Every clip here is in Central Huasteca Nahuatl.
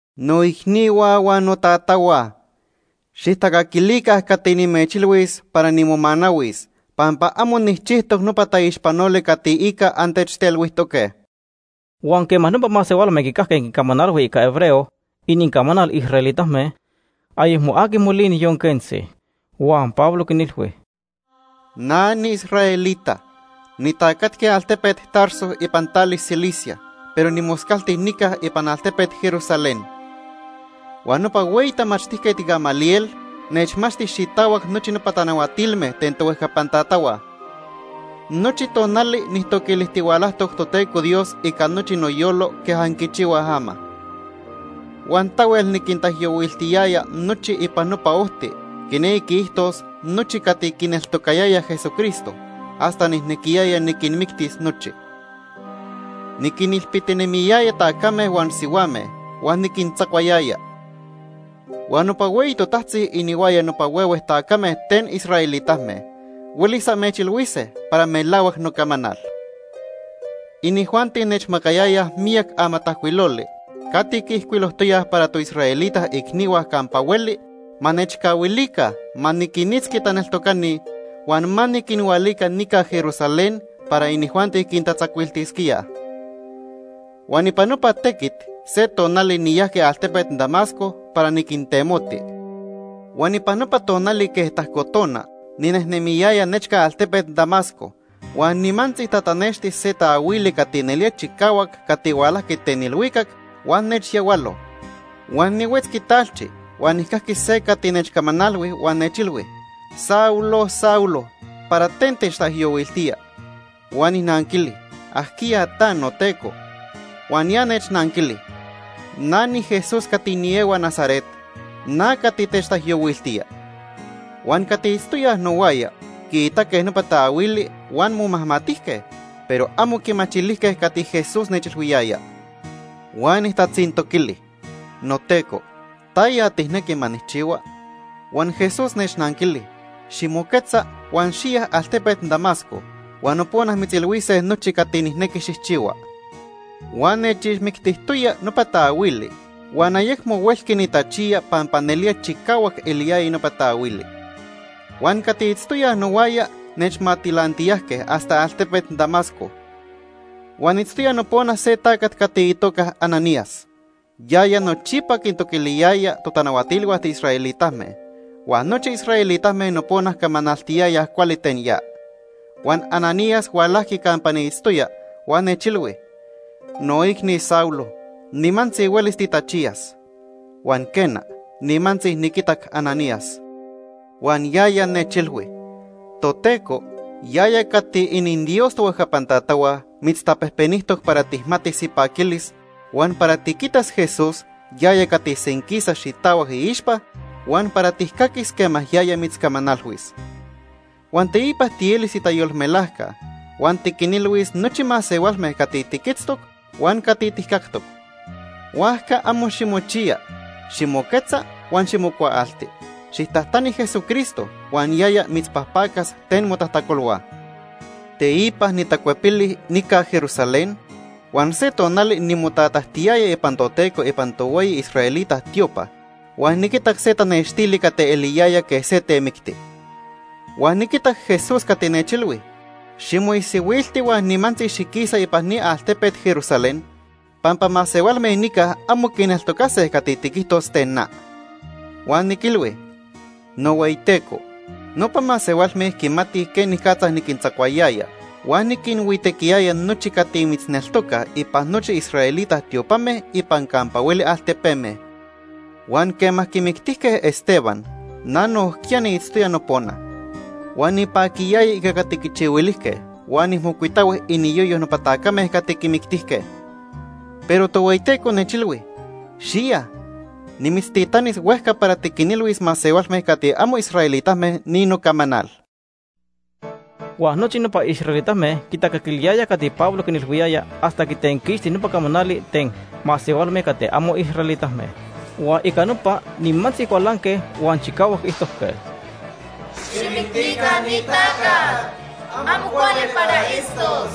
“Noicnihua huan notatahua, xijtacaquilica cati nimechilhuis para nimomanahuis pampa amo nijchijtoc nopa taixpanoli cati ica antechtelhuijtoque.” Huan quema nopa masehualme quicajque quincamanalhui ica hebreo, inincamanal israelitame, ayecmo aqui molini, yon quentzi. Huan Pablo quinilhui: “Na niisraelita. Nitacatqui altepet Tarso ipan tali Cilicia, pero nimoscalti nica ipan altepet Jerusalén. Huan nopa hueyi tamachtijquet Gamaliel nechmachti xitahuac nochi nopa tanahuatilme ten tohuejcapan tatahua. Nochi tonali nijtoquilijtihualajtoc Toteco Dios ica nochi noyolo quej anquichihuaj ama. Huan tahuel niquintaijyohuiltiyaya nochi ipan Nopa Ojti, quinequi quiijtos nochi cati quineltocayayaj Jesucristo, hasta nijnequiyaya niquinmictis nochi. Niquinilpitinemiyaya tacame huan sihuame huan niquintzacuayaya. Huan nopa hueyi totajtzi inihuaya nopa huehue tacame ten israelitame huelis amechilhuise para melahuac nocamanal. Inijuanti nechmacayayaj miyac amatajcuiloli cati quiijcuilojtoyaj para toisraelita icnihua campa hueli ma nechcahuilica ma niquinitzqui taneltocani huan ma niquinhualica nica Jerusalén para inijuanti quintatzacuiltisquíaj. Huan ipan nopa tequit se tonali niyajqui altepet Damasco para niquintemoti. “Huan ipan nopa tonali quej tajco tona ninejnemiyaya nechca altepet Damasco, huan nimantzi tatanexti se taahuili cati nelía chicahuac cati hualajqui ten ilhuicac huan nechyahualo. Huan nihuetzqui talchi huan nijcajqui se cati nechcamanalhui huan nechilhui: ‘Saulo, Saulo, ¿para ten techtaijyohuiltía?’ “Huan nijnanquili: ‘¿Ajquiya ta, noTeco?’ “Huan ya nechnanquili: ‘Na niJesús cati niehua Nazaret. Na cati techtaijyohuiltía.’ “Huan cati itztoyaj nohuaya quiitaque nopa taahuili huan momajmatijque, pero amo quimachilijque cati Jesús nechilhuiyaya. Huan nijtatzintoquili: ‘Noteco, ¿taya tijnequi ma nijchihua?’ “Huan Jesús nechnanquili: ‘Ximoquetza huan xiya altepet Damasco huan nopona mitzilhuise nochi cati nijnequi xijchihua.’ “Huan nechixmictijtoya nopa taahuili huan ayecmo huelqui nitachiya pampa nelía chicahuac eliyaya nopa taahuili. Huan cati itztoyaj nohuaya nechmatilantiyajque hasta altepet Damasco. “Huan itztoya nopona se tacat cati itoca Ananías. Yaya nochipa quintoquiliyaya totanahuatilhua tiisraelitame, huan nochi israelitame nopona camanaltiyayaj cuali ten ya. Huan Ananías hualajqui campa niitztoya huan nechilhui: ‘Noicni Saulo, nimantzi huelis titachiyas.’ “Huan quena, nimantzi niquitac Ananías. Huan yaya nechilhui: ‘Toteco, yaya cati ininDios tohuejcapan tatahua, mitztapejpenijtoc para tijmatis ipaquilis, huan para tiquitas Jesús, yaya cati senquisa xitahuac iixpa, huan para tijcaquis quema yaya mitzcamanalhuis. Huan teipa tielis itayolmelajca huan tiquinilhuis nochi masehualme cati tiquitztoc huan cati tijcactoc. Huajca amo ximochiya. Ximoquetza huan ximocuaalti. Xijtajtani Jesucristo huan yaya mitzpajpacas ten motajtacolhua.’ “Teipa nitacuepili nica Jerusalén huan se tonali nimotatajtiyaya ipan Toteco ipan tohueyi israelita tiopa huan niquitac se tanextili cati eliyaya quej se temicti. Huan niquitac Jesús cati nechilhui: ‘Ximoisihuilti huan nimantzi xiquisa ipan ni altepet Jerusalén pampa masehualme nica amo quineltocase cati tiquijtos ten na.’ “Huan niquilhui: ‘NohueyiTeco, nopa masehualme quimatij quenicatza niquintzacuayaya huan niquinhuitequiyaya nochi cati mitzneltocaj ipan nochi israelita tiopame ipan campa hueli altepeme. Huan quema quimictijque Esteban, na nojquiya niitztoya nopona. Huan nipaquiyaya ica cati quichihuilijque huan nijmocuitahui iniyoyo nopa tacame cati quimictijque.’ “Pero Tohueyiteco nechilhui: ‘Xiya. Nimitztitanis huejca para tiquinilhuis masehualme cati amo israelitame ni nocamanal.’” Huan nochi nopa israelitame quitacaquiliyayaj cati Pablo quinilhuiyaya hasta quitenquixti nopa camanali ten “masehualme cati amo israelitame.” Huan ica nopa nimantzi cualanque huan chicahuac quiijtojque: “¡Xijmictica ni tacat! ¡Amo cuali para itztos!”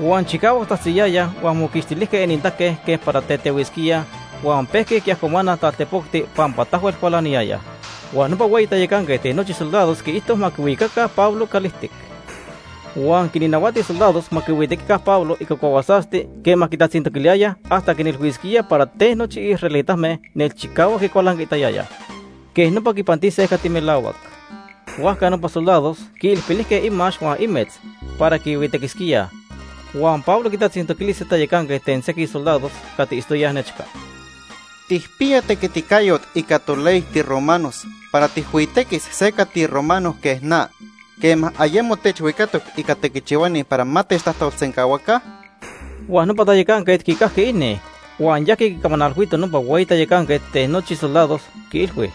Huan chicahuac tzajtziyayaj huan moquixtilijque inintaque quej para tetehuisquíaj huan pejque quiajcomanaj taltepocti pampa tahuel cualaniyayaj. Huan nopa hueyi tayacanquet ten nochi soldados quiijto ma quihuicaca Pablo calijtic. Huan quinnahuati soldados ma quihuitequica Pablo ica cuahuasasti quema quitatzintoquiliyayaj hasta quinilhuisquía para ten nochi israelitame nelchicahuac quicualancaitayayaj. Quej nopa quipantise cati melahuac. Huajca nopa soldados quiilpilijque imax huan imetz para quihuitequisquíaj, huan Pablo quitatzintoquili se tayacanquet ten sequij soldados cati itztoyaj nechca: ―¿Tijpiya tequiticayot ica toley tiromanos para tijhuitequis se cati romano quej na quema ayemo techhuicatoc ica tequichihuani para ma techtajtolsencahuaca? Huan nopa tayacanquet quicajqui ini, huan yajqui quicamanalhuito nopa hueyi tayacanquet ten nochi soldados, quiilhui: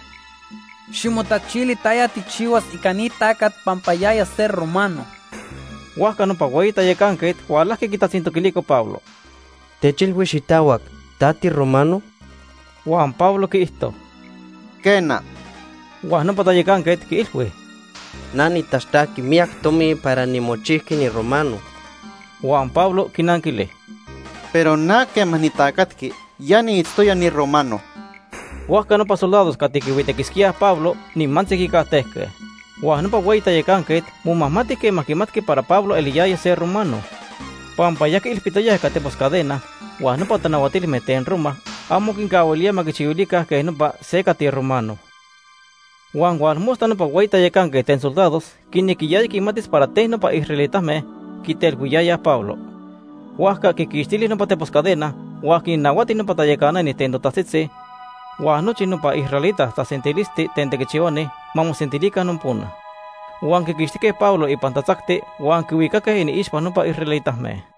―Ximotachili taya tijchihuas ica ni tacat pampa yaya se romano. Huajca nopa hueyi tayacanquet hualajqui quitatzintoquilico Pablo: ―Techilhui xitahuac. ¿Ta tiromano? Huan Pablo quiijto: ―Quena. Huan nopa tayacanquet quiilhui: ―Na nitaxtajqui miyac tomi para nimochijqui niromano. Huan Pablo quinanquili: ―Pero na quema nitacatqui, ya niitztoya niromano. Huajca nopa soldados cati quihuitequisquíaj Pablo nimantzi quicajtejque. Huan nopa hueyi tayacanquet momajmati quema quimatqui para Pablo eliyaya se romano, pampa ya quiilpitoyaj ica tepos cadena huan nopa tanahuatilme ten Roma amo quincahuilía ma quichihuilica quej nopa se cati romano. Huan tonili nopa hueyi tayacanquet ten soldados quinequiyaya quimatis para ten nopa israelitame quitelhuiyayaj Pablo. Huajca quiquixtili nopa tepos cadena, huan quinnahuati nopa tayacanani ten totajtzitzi huan nochi nopa israelita tasentilisti ten tequichihuani ma mosentilica nopona. Huan quiquixtijque Pablo ipan tatzacti huan quihuicaque iniixpa nopa israelitame.